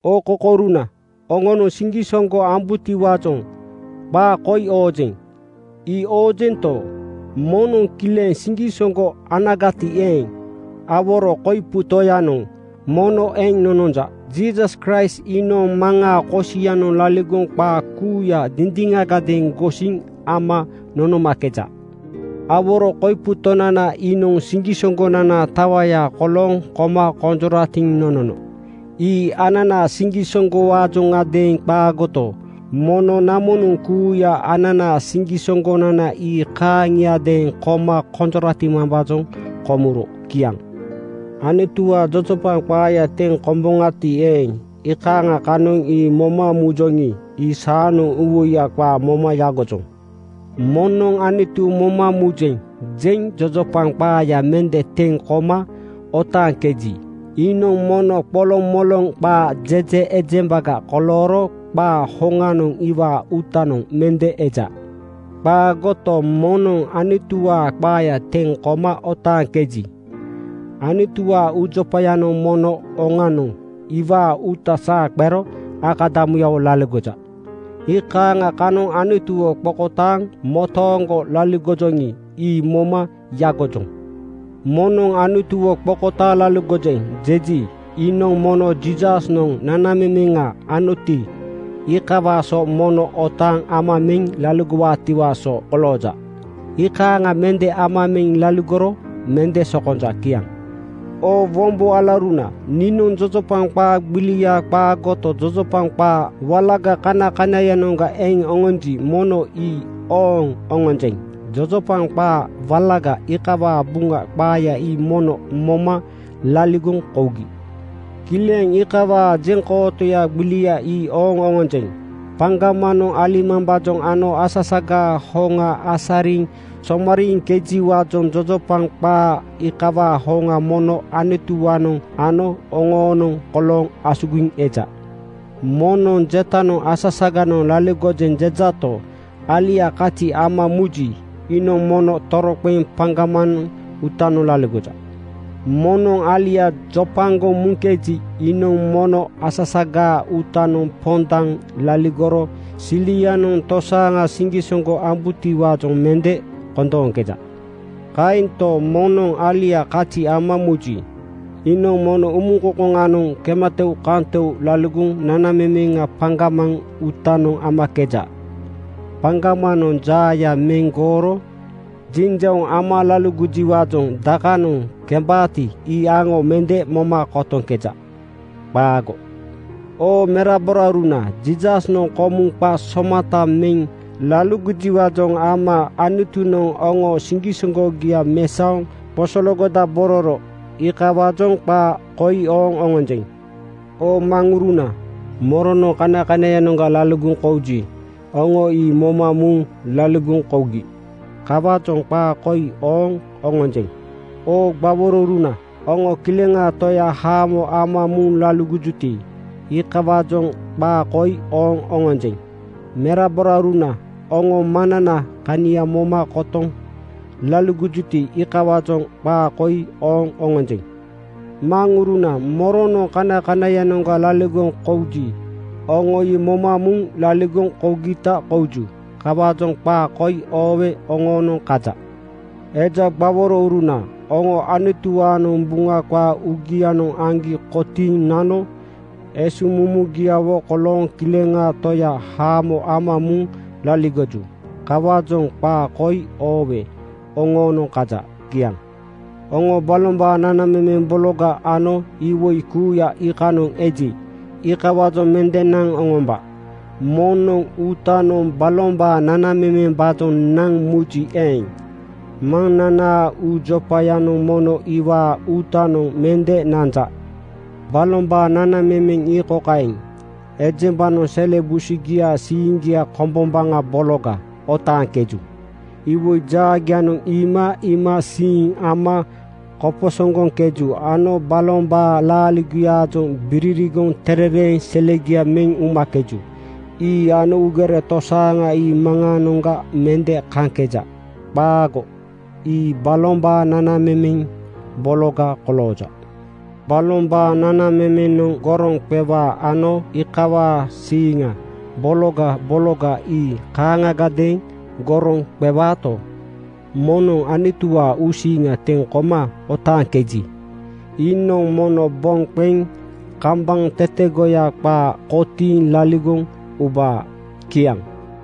Oo kokouruna, oŋonoŋ siŋgisoŋgo ambubotiwaajoŋ qaa koi oojeŋ. Ii oojento, moŋnoŋ kileŋ siŋgisoŋgo anagati eeŋ, aworo koipu Tonananoŋ mono eŋ nononja. Jiisas Kraist iinoŋ Maŋaa kosianoŋ laligoŋ qaa kuuya dindiŋagadeeŋ gosiŋ ama nonomakeja. Aworo koipu Tonana iinoŋ siŋgisoŋgonanaa tawaya kolooŋ koma konjoratiŋ nonono. Ii ananaa siŋgisoŋgowaajoŋadeeŋ qaagoto, mono namonoŋ kuuya ananaa siŋgisoŋgonana ii kaaŋiadeeŋ koma konjoratimambaajoŋ komuro. Kiaŋ. Anutuwaa jojopaŋ qaaya teŋ komakeboŋati eeŋ, iikaaŋa kanoŋ ii moma mujoŋi, ii saanoŋ uuwoiya qaa moma yagojoŋ. Moŋnoŋ “Anutu moma mujeŋ,” jeŋ jojopaŋ qaaya mende teŋ koma otaaŋkeji, iinoŋ mono qolomoloŋ qaa jeje ejembaga kolooro qaa hoŋanoŋ iwaa uutanoŋ mende eja. Qaagoto, moŋnoŋ Anutuwaa qaaya teŋ koma otaaŋkeji, Anutuwaa uujopayanoŋ mono oŋanoŋ iwaa uuta saa qero akadamuyawo laligoja. Iikaaŋa kanoŋ Anutuwo qokotaaŋ motooŋgo laligojoŋi, ii moma yagojoŋ. Moŋnoŋ “Anutuwo qokotaaŋ laligojeŋ,” jeji, iinoŋ mono Jiisasnoŋ nanamemeŋa anoti, iikawaa so mono otaaŋ ama meŋ laligowaatiwaa so kolooja. Iikaaŋ mende ama meŋ laligoro mende sokonja. Kiaŋ. Oo wombo alauruna, niinoŋ jojopaŋ qaa gbilia qaagoto, jojopaŋ qaa walaga kanakanaiyanoŋga eŋ oŋonji, mono ii ooŋ oŋonjeŋ. Jojopaŋ qaa walaga iikawaa Buŋa qaaya ii mono moma laligoŋ kougi. Kileŋ iikawaa jeŋkootoya gbilia ii ooŋ oŋonjeŋ. Paŋgamanoŋ alimambaajoŋ ano asasagaa hoŋa asariŋ somariiŋkejiwaajoŋ jojopaŋ qaa iikawaa hoŋa mono Anutuwaanoŋ ano oŋoonoŋ kolooŋ asugiŋ eja. Moŋnoŋ jetanoŋ “Asasaganoŋ laligojeŋ,” jejato, alia kazi ama muji, iinoŋ mono toroqeŋ paŋgamaŋ uutanoŋ laligoja. Moŋnoŋ alia jopagoŋ muŋkeji, iinoŋ mono asasagaa uutanoŋ pondaŋ laligoro silianoŋ tosaaŋa siŋgisoŋgo ambutiwaajoŋ mende kondooŋkeja. Kaento, moŋnoŋ alia kazi ama muji, iinoŋ mono umuŋkoŋkoŋanoŋ kematoukantou laligoŋ nanamemeŋa paŋgamaŋ uutanoŋ amakeja. Paŋgamanoŋ jaaya meŋ gooro jinjauŋ ama laligojiwaajoŋ dakanoŋ kembaati, ii aŋo mende moma kotoŋkeja. Qaago. Oo meraborauruna, Jiisasnoŋ komuŋ qa somata meŋ laligojiwaajoŋ ama Anutunoŋ oŋoo siŋgisoŋgogia mesaoŋ qosoloŋgodabororo. Iikawaajoŋ qaa koi ooŋ oŋonjeŋ. Oo maŋuruna, moronoŋ kanakanaiyanoŋga laligoŋ kouji, oŋo ii moma muŋ laligoŋ kougi. Kawaajoŋ qaa koi ooŋ oŋonjeŋ. Oo gbaworouruna, oŋo kileŋaa Toya haamo ama muŋ laligojuti, iikawaajoŋ qaa koi ooŋ oŋonjeŋ. Meraborauruna, oŋo Maŋnanaa kania moma kotoŋ laligojuti, iikawaajoŋ qaa koi ooŋ oŋonjeŋ. Maŋuruna, moronoŋ kanakanaiyanoŋga laligoŋ kouji, oŋo ii moma muŋ laligoŋ kougita kouju. Kawaajoŋ qaa koi oowe oŋoonoŋ kaja. Eja gbaworouruna, oŋo Anutuwaanoŋ Buŋa qaa uugianoŋ aŋgi kotiiŋ nano esuŋmumugiawo kolooŋ kileŋaa Toya haamo ama muŋ laligoju. Kawaajoŋ qaa koi oowe oŋoonoŋ kaja. Kiaŋ. Oŋo balombaa nanamemeŋ bologa ano iwoi kuuya iikanoŋ eji, iikawaajoŋ mende naŋ oŋomba. Moŋnoŋ uutanoŋ balombaa nanamemembaajoŋ naŋ muji eeŋ, Maŋnanaa uujopayanoŋ mono iwaa uutanoŋ mende nanja. Balombaa nanamemeŋ ii kokaeŋ: Ejembanoŋ sele busugiaa siiŋgia kombombaŋa bologa otaaŋkeju. Iwoi jaagianoŋ iima iimasiiŋ ama koposoŋgoŋkeju ano balombaa laaligogiaajoŋ biririgoŋ terereeŋ selegia meŋ umakeju. Ii ano uugere tosaaŋa ii Maŋaanoŋga mende kaŋkeja. Qaago! Ii balombaa nanamemeŋ bologa kolooja. Balombaa nanamemenoŋ goroŋ qewaa ano iikawaa siiŋa bologa bologa ii kaaŋagadeeŋ goroŋ qewuto, moŋnoŋ Anutuwaa uusiiŋa teŋ koma otaaŋkeji, iinoŋ mono boŋ qeŋ kambaŋ tetegoya qaa kotiiŋ laligoŋ ubaa. Kiaŋ.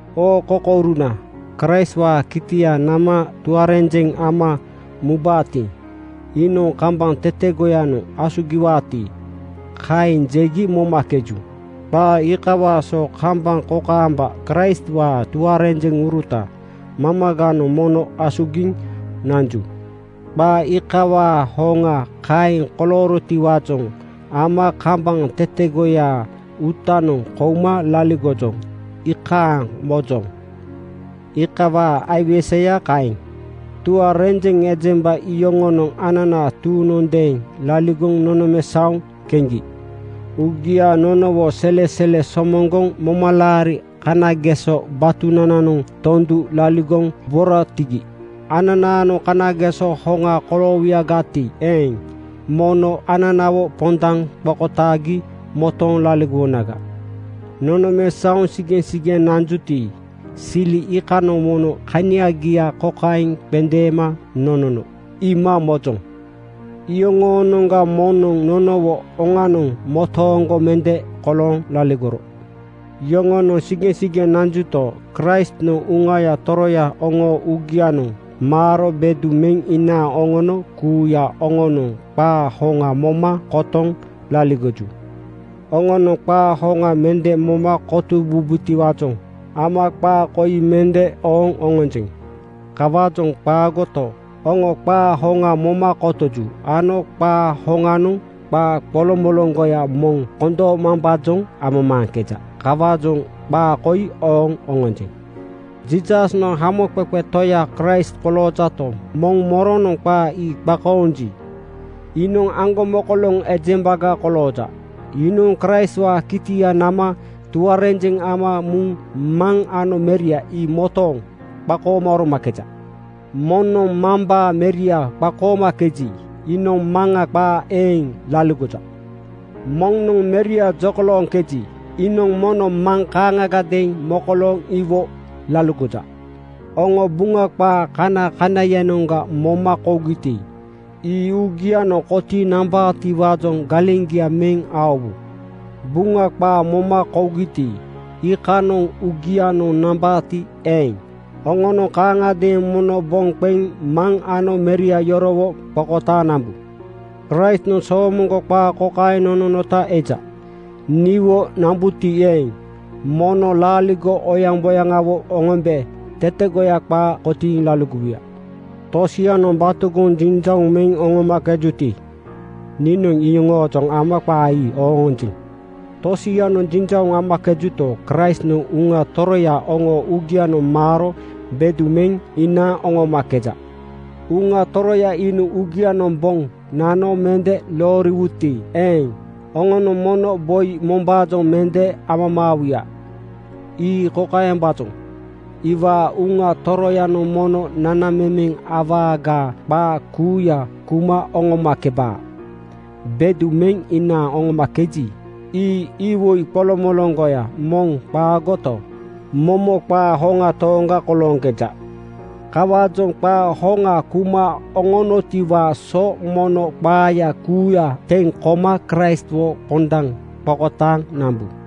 Oo kokouruna, Kraistwaa kitia nama tuarenjeŋ ama mubaati, iinoŋ kambaŋ tetegoyanoŋ asugiwaati, kaeŋ jegi momakeju. Qaa iikawaa so kambaŋ kokaamba Kraistwaa tuarenjeŋuruta mamaganoŋ mono asugiŋ nanju. Qaa iikawaa hoŋa kaeŋ koloorotiwaajoŋ ama kambaŋ tetegoyaa uutanoŋ kouma laligojoŋ, iikaaŋ mojoŋ. Iikawaa aiweseya kaeŋ. Tuarenjeŋ ejemba iyoŋonoŋ ananaa tuuŋnondeeŋ laligoŋ nonomesaoŋ keŋgi. Uugia nonowo selesele somoŋgoŋ momalaari kanageso batunananoŋ tondu laligoŋ boratigi. Ananaanoŋ kanageso hoŋa koloowuyagati eeŋ, mono ananawo pondaŋ qokotaagi motooŋ laligowonaga. Nonomesaoŋ sigeŋsigeŋ nanjuti, sili iikanoŋ mono kaniagia kokaeŋ qendeema nonono iima mojoŋ: Iyoŋoonoŋga moŋnoŋ nonowo oŋanoŋ motooŋgo mende kolooŋ laligoro. Yoŋonoŋ sigeŋsigeŋ nanjuto, Kraistnoŋ Uŋaya Toroya oŋoo uugianoŋ maaro bedu meŋ inaaŋ oŋono kuuya oŋonoŋ qaa hoŋa moma kotoŋ laligoju. Oŋonoŋ qaa hoŋa mende moma kotowubotiwaajoŋ ama qaa koi mende ooŋ oŋonjeŋ. Kawaajoŋ qaagoto, oŋo qaa hoŋa moma kotoju ano qaa hoŋanoŋ qaa qoloŋmoloŋgoya moŋ kondoomambaajoŋ amamaaŋkeja. Kawaajoŋ qaa koi ooŋ oŋonjeŋ. Jiisasnoŋ Hamoqeqe Toya Kraist koloojato, moŋ moronoŋ qaa ii qakoonji, iinoŋ aŋgomokoloŋ ejembaga kolooja. Iinoŋ Kraistwaa kitia nama tuarenjeŋ ama muŋ Maŋ ano Meria ii motooŋ qakooma oromakeja. Moŋnoŋ Mambaa Meria qakoomakeji, iinoŋ Maŋa qaa eeŋ laligoja. Moŋnoŋ Meria jokolooŋkeji, iinoŋ mono Maŋ kaaŋagadeeŋ mokolooŋ iwo laligoja. Oŋo Buŋa qaa kanakanaiyanoŋga moma kougiti, ii uugianoŋ kotiiŋ nambaatiwaajoŋ galeŋgia meŋ aowu. Buŋa qaa moma kougiti, iikanoŋ uugianoŋ nambaati eeŋ, oŋonoŋ kaaŋagadeeŋ mono boŋ qeŋ Maŋ ano Meria yorowo qokotaaŋ nambu. Kraistnoŋ soomoŋgo qaa kokaeŋ nononota eja, “Niwo nambuti eeŋ, mono laaligo oyaŋboyaŋawo oŋombe tetegoya qaa kotiiŋ laligowuya.” Tosianoŋ batogoŋ jinjauŋ meŋ oŋomakejuti, niinoŋ iyoŋoojoŋ ama qaa ii ooŋ oŋonjeŋ. Tosianoŋ jinjauŋ amakejuto, Kraistnoŋ Uŋa Toroya oŋoo uugianoŋ maaro bedu meŋ inaaŋ oŋomakeja. Uŋa Toroya iinoŋ uugianoŋ boŋ nano mende looriwuti eeŋ, oŋonoŋ mono boi mombaajoŋ mende amamaawuya. Ii kokaembaajoŋ: Iwaa Uŋa Toroyanoŋ mono nanamemeŋ awagaa qaa kuuya kuma oŋomakebaa. Bedu meŋ inaaŋ oŋomakeji, ii iwoi qoloŋmoloŋgoya moŋ qaagoto, momo qaa hoŋa tooŋga kolooŋkeja. Kawaajoŋ qaa hoŋa kuma oŋonotiwaa so mono qaaya kuuya teŋ koma Kraistwo pondaŋ qokotaaŋ nambu.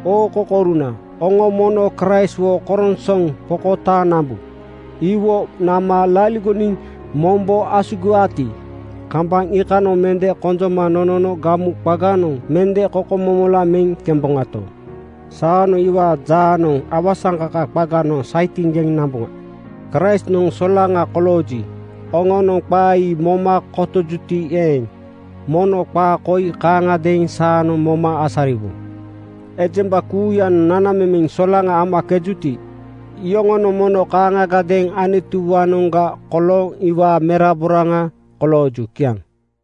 Oo kokouruna, oŋo mono Kraistwo koronsoŋ qokotaaŋ nambu. Iwo nama laligoniŋ mombo asugiwaati, kambaŋ iikanoŋ mende konjoma nonono gamu qaganoŋ mende kokomomola meŋ kemboŋato, saanoŋ iwaa jaanoŋ awasaŋkaka qaganoŋ saitiŋgeŋ namboŋa. Kraistnoŋ solaŋa kolooji, oŋonoŋ qaa ii moma kotojuti eeŋ, mono qaa koi kaaŋagadeeŋ saanoŋ moma asariwu: Ejemba kuuyanoŋ nanamemeŋ solaŋa amakejuti, iyoŋonoŋ mono kaaŋagadeeŋ Anutuwaanoŋga kolooŋ iwaa meraboraaŋa kolooju. Kiaŋ.